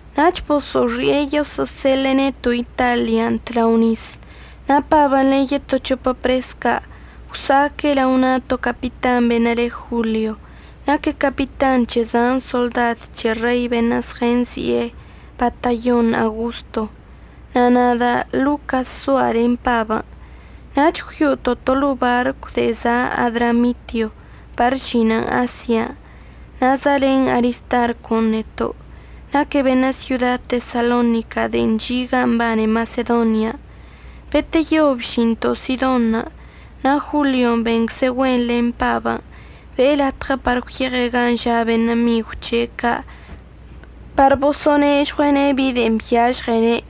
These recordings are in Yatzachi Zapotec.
Nach boso'oxi'e yoso'oseḻe'e neto' Italian' tlao nis. Na' Pabən' len yeto c̱hopə pres ca' gwsa'aque' lao na' to capitan beṉə' le Jolio. Naque' capitan c̱he zan soḻdad c̱he rein' beṉə' zɉənzi'e “Batallon Augosto”. Na' nada' Locas zoa' len Pabən'. Nach gwyo'oto' to ḻo'o barcw de'e za' Adramitio par əžinən Asia. Na' za'alen Aristarcon' neto'. Naque' beṉə' syoda Tesalonica de'en chi' gan' mbane Masedonian'. Beteyo bžinto' Sidonṉə' na' Jolion' bencze' güen len Pabən' be'e latɉə par gwyeɉe' gan' ža' beṉə' migw c̱he' ca' par boso'onežɉue'ene' bi de'en byažɉene'.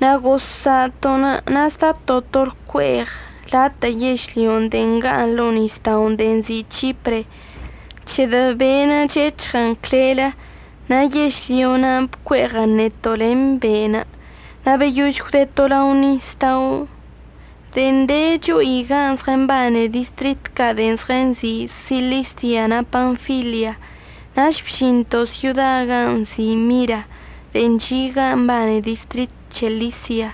Na' gozsa'ato'onə' na' zdato' to lcue'eɉ latə' yežlyo de'e nga'aṉ ḻo'o nisda'onə' de'en nzi' C̱hipre, c̱hedə' be'enə' chec̱hɉən clelə, na' yežlyo na'anə' bcue'eɉən neto' len be'enə'. Na' beyož gwdeto' lao nisdao' de'en de cho'i gan' zɉəmbane distrit ca' de'en zɉənzi' Silisia na' Panfilia nach bžinto' syoda gan' nzi' Mira de'en chi' gan' mbane distrit c̱he Lisia.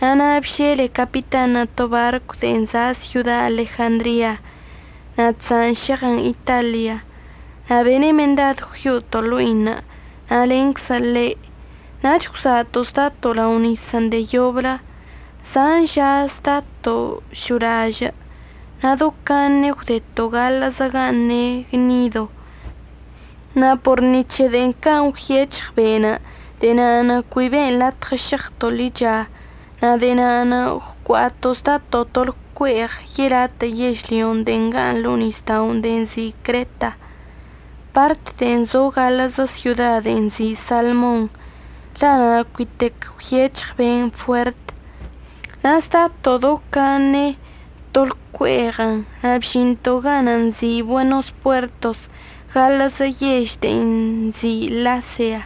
Na' na' bžele capitanṉə' to barcw de'en za' syoda Alejandria na' chza'an šeɉən Italian', na' bene' mendad gwyo'oto' ḻo'inə' na' lenczə ḻe'. Nach gwza'ato' zdato' lao nisən' de'e yoblə. Zan ža zdato' šo'olažə' na' do caṉe gwdeto' gaḻə'əzə gan' ne' Gnido. Na' por ni c̱he can' gwyec̱hɉ be'enə' de'e na'anə' cui be'en latɉə šeɉto' ḻicha na' de'e na'anə' gwcua'ato' zdato' to lcue'eɉ yelatə' yežlyo de'e nga'aṉ ḻo'o nisda'onə' de'en nzi' Creta, part de'en zo gaḻə'əzə syodan' de'en nzi' Salmon, la' na' cuitec gwyec̱hɉ be'enə' fuert. Na' zdato' do caṉe to lcue'eɉən' na' bžinto' ganə' nzi' Buenos Puertos gaḻə'əzə yež de'en nzi' Lasea.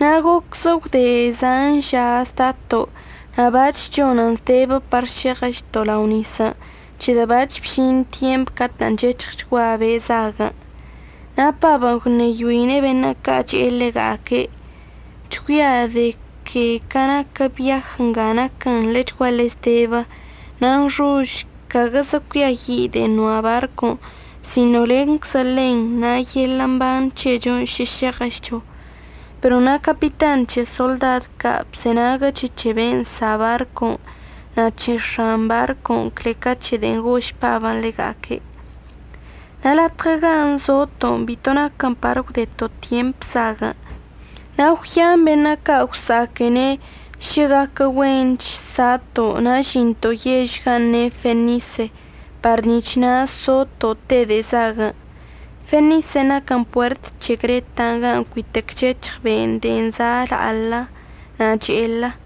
Na' gocze gwde zan ža zdato' na' bac̱h chonən zdebə par šeɉəchto' lao nisən' c̱hedə' bac̱h bžin tyemp catə' chec̱hɉchgua be' zaguən'. Na' Pabən' gwṉeyoine' beṉə' ca' che'e ḻega'aque': ―Chgüia' de que ca naquə biaj nga naquən ḻechguaḻe zdebə na' nxož caguəgazə cuiayi' de'en noa' barcon' sino lenczə ḻen na' len yeḻə' mban c̱hecho šə šeɉəchcho. Pero na' capitan c̱he soḻdad ca' bzenaguəche' c̱he ben' nsa' barcon' na' c̱he x̱an barcon' cle ca c̱he de'en gož Pabən' ḻega'aque'. Na' latɉə gan' zoto' bito naquən par əgwdeto' tyemp zaguən', na' gwyan beṉə' ca' gwsa'aquene' šə gaquə güench sa'ato' na' əžinto' yež gan' ne' Fenise par nic̱h na' zoto' te de'e zaguən'. Fenisen' naquən puert c̱he Creta gan' cuitec chec̱hɉ be' de'en za' la'alə na' che'elə.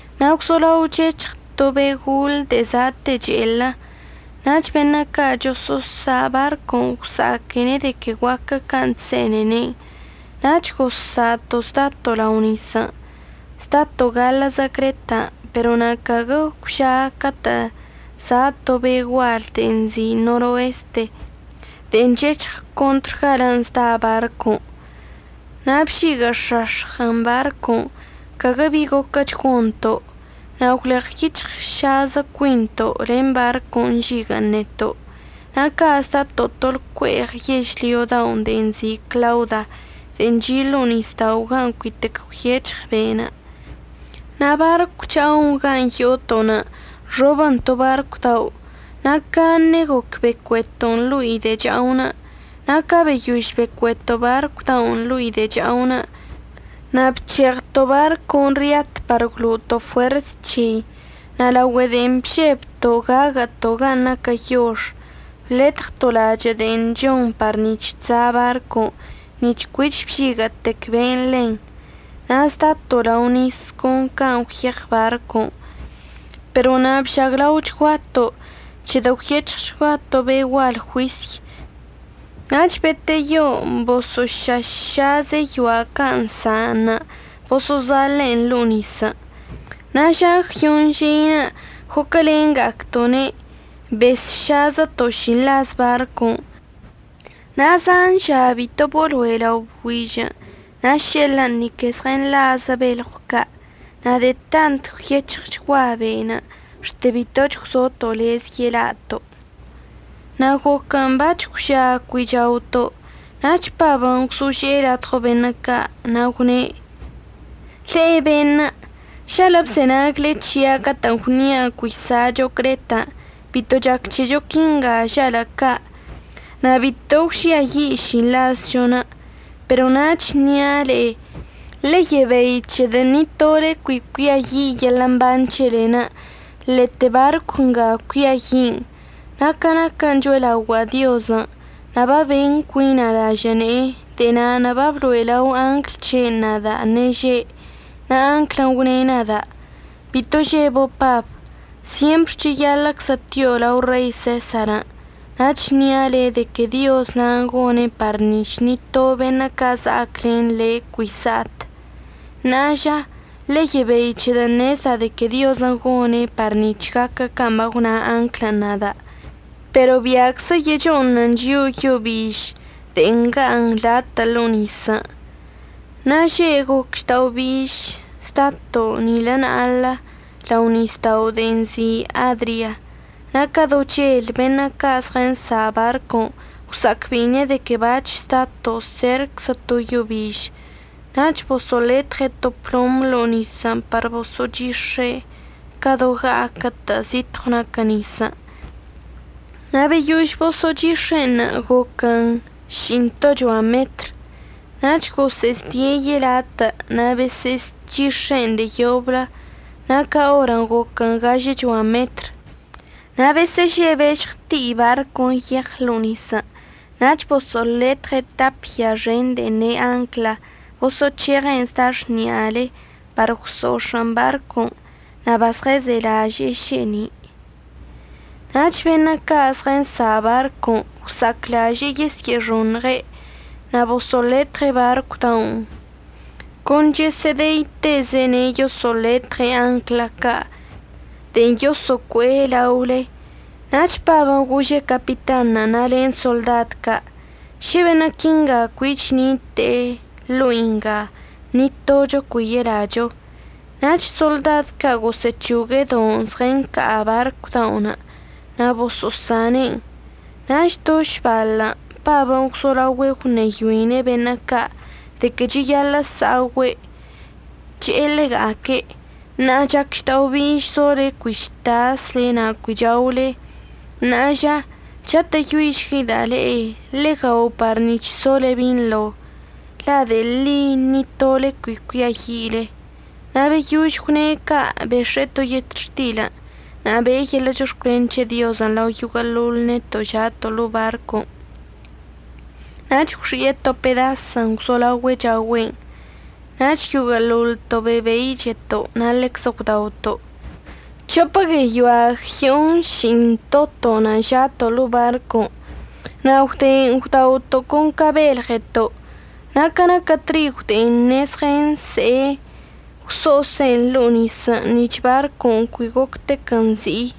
Na' gwzolao chec̱hɉ to be' gol de'e za'ate che'elə, nach beṉə' ca' choso'osa' barcon' gwsa'aquene' de que guaquə can' chse'ene'ene', nach gozsa'ato' zdato' lao nisən', zdato' gaḻə'əzə Cretan'. Pero na' caguə gwža catə' za' to be' gual de'e nzi' Noreste de'e chec̱hɉən contr galən' zda barcon'. Na' bžiguə'əx̱ax̱ɉən barcon', caguə bi goquəch gonto'. Na' gwleɉyic̱hɉšazə cuinto' len barcon' nžiguə'ən neto'. Na' ca' zdato' to lcue'eɉ yežlyo dao' de'e nzi' Clauda de'e chi' ḻo'o nisda'onə' gan' cuitec gwyec̱hɉ be'enə'. Na' barcw cha'o gan' yo'oto'onə' nxobən to barcw dao', na' caṉe goc becueto'on ḻo'i de'e cha'onə'. Na' ca beyož becueto' barcw da'onə' ḻo'i de'e cha'onə', na' bc̱heɉto' barcon' ryat par gwlo'oto' fuers c̱hei. Na' laogüe de'e bžebto' gaguə'əto' gan' naquə yox, bletɉto' lachə' de'en chon par nic̱h chza' barcon' nic̱h cuich bžiguə'ətec be'enə' ḻen. Na' zdato' lao nisən' con can' gwyeɉ barcon'. Pero na' bžaglaochguato' c̱hedə' gwyec̱hɉchgua to be' gual juisy nach beteyo boso'ošaššaze' yoa' ca' nsa'anṉə' boso'ozaḻe'en ḻo'o nisən'. Na' ža gwyoṉ žeinə' goclenga'acto'one' besšazəto' šinḻaz barcon'. Na' zan ža bito bolo'e lao bgüižən' na' še'elən' ni que zɉənḻa'azə belɉw ca'. Na' de'e tant gwyec̱hɉchgua be'enə' xte bitoch gwzoto' lez yelato'. Na' goquən' bac̱h gwža cui chaoto', nach Pabən' gwzože'e ladɉo beṉə' ca' na' gwne': ―Le'e beṉə', žalə' əbzenagle c̱hia' catə'ən gwnia' cui sa'acho Cretan' bito chac c̱hecho quinga žalə' ca' na' bito gwžiayi' šinḻazchon'. Pero na' chnia' le'e ḻe'e yebei c̱hedə' ni to le'e cui cuiayi' yeḻə' mban c̱helen', lete barcw nga cuiayi'in. Na' ca naquə cho'elaogua'a Diozən' na' baben cuina' lažə' ne'enə', de'e na'anə' bablo'e lao angl c̱he'enə' nada' ṉeže', na' anglən' gwne' nada': “Bito žebo' Pab. Syempr cheyaḻə'əczə tio' lao Rei Sesarən', na' əchnia' le' de que Dioz na'anə' gone' par nic̱h ni to beṉə' ca' za'ac len le' cui sa'at.” Ṉa'a ža, ḻe'e yebei, c̱hedə' ṉezda' de que Diozən' gone' par nic̱h gaquə can' bagwna anglən' nada'. Pero bia'aczə yecho'oṉən chio'o yo biž de'e nga'aṉ latə' ḻo'o nisən'. Na' že' goc žda'obiž zdato' nilə na'aḻə lao nisda'o de'enə' nzi' Adria. Na' ca do chel beṉə' ca' zɉənsa' barcon' gwsa'acbe'ine' de que bac̱h zdato' serczə to yo biž. Nach boso'oletɉe' to plom ḻo'o nisən' par boso'ochix̱e' ca do ɉa'aquə'ətə' zitɉw naquə nisən', na' beyož boso'ochix̱e'enṉə' goquən ši'intochoa metr. Nach gosə'əzdie' yelatə' na' bosə'əzchix̱e'en de'e yoblə na' ca orən' goquən gažəchoa metr. Na' besə'əžebe' žɉti'i barcon' yeɉ ḻo'o nisən' nach boso'oletɉe' tap ya xen de'en ne' ancla, boso'oc̱heɉe'en zda xni'alei par gwso'ox̱ə'ən barcon' na' bazɉəzelaže'e še'eni'. Nach beṉə' ca' zɉənsa' barcon' gwsa'aclaže'e yesyə'əxoṉɉe' na' boso'oletɉe' barcw da'onə' con chosə'əde'itezene' yoso'oletɉe' ancla ca' de'en yoso'ocue' laolei. Nach Pabən' gože' capitanṉə' na' len soḻdad ca': ―Šə beṉə' quinga cuich ṉite'e ḻo'i nga, ni tocho cui yelacho. Nach soḻdad ca' gosə'əc̱hogue' don' zɉənca'a barcw da'onə' na' boso'osane'en. Nach do šbaḻ Pabən' gwzolao gwṉeyoine' beṉə' ca' de que cheyaḻə' sa'ogüe', che'e ḻega'aque': ―Ṉa'a chac žda'obiž zole cui chtasle na' cui chaole. Ṉa'a ža, chatə'əyoišgueida' le'e ḻe'e gao par nic̱h sole binḻo, la' de'e ḻi ni tole cui cuiayi'ile. Na' beyož gwne' ca' bex̱e'e to yetxtilən' na' be'e yeḻə' chox̱cwlen c̱he Diozən' lao yoguə'əḻoḻ neto' ža'ato' ḻo'o barcon' nach gwxi'e to pedasən gwzolaogüe' chaogüe'en. Nach yoguə'əḻoḻto' bebeicheto' na' ḻeczə gwdaoto'. C̱hopə gueyoa gyonši'intoto'onə' ža'ato' ḻo'o barcon'. Na' gwde gwdaoto' con ca belɉeto' na' ca naquə trigon' de'e ṉe'e zɉənse'e, gwso'ose'en ḻo'o nisən' nic̱h barcon' cuich goctequən zi'i.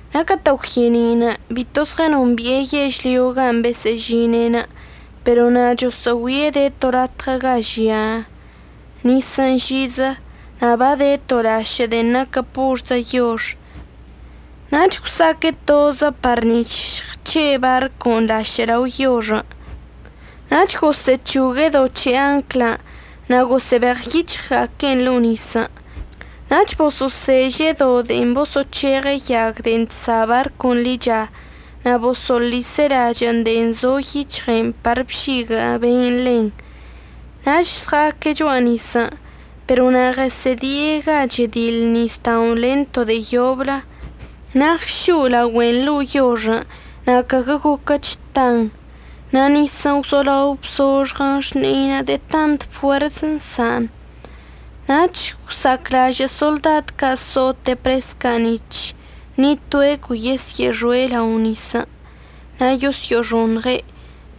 Na' catə' gwye'eni' bito zɉənombi'e yežlyon' gan' besə'əžine' pero na' choso'ogüie' de to latɉə ga žia nisən' žizə na' bade to lašə' de'e naquə porzə yox. Nach gwsa'aque' tozə par nic̱h žɉəc̱he' barcon' lašə' lao yoxən'. Nach gosə'əc̱hogue' do c̱he ancla ca' na' gosə'əbeɉyic̱hɉga'aque'en ḻo'o nisən'. Nach boso'oseže' do de'en boso'oc̱heɉe' yag de'en chsa' barcon' ḻicha na' boso'oḻise' lachə' de'en zo yic̱hɉen' par bžiguə' be'enə' ḻen, nach əzɉa'aque' cho'a nisən'. Pero na' ɉəsə'ədi'e ga chediḻ nisda'onə' len to de'e yoblə, na' ɉšo'o laogüen' ḻo'o yoxən' na' caguə goquəch tan. Na' nisən' gwzolao bzoxɉən xni'einə' de'e tant fuers nsa'an. Nach gwsa'aclažə' soḻdad ca' so'ote' pres ca' nic̱h ni toe' cui yesyə'əxoe' lao nisən' na' yosyo'oxoṉɉe'.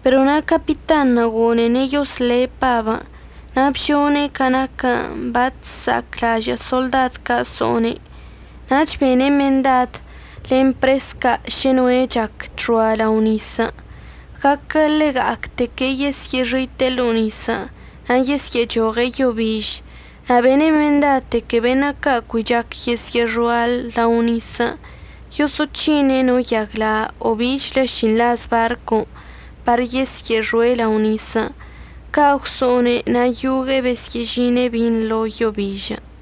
Pero na' capitanṉə' gone'ene' yosle' Pabən' na' bžone' ca naquən' bachsa'aclažə' soḻdad ca' so'one', nach bene' mendad len pres ca' šə noe' chac chxoa lao nisən', guaquə ḻega'acteque' yesyə'əxite'e lao nisən' na' yesyə'əchoɉe' yo biž. Na' bene' mendad de que beṉə' ca' cui chac yesə'əxoa lao nisən' yoso'oc̱hine' no yagla' o bichlə šinḻaz barcon' par yesyə'əxoe' lao nisən'. Ca' gwso'one' na' yogue'e besə'əžine' binḻo yo bižən'.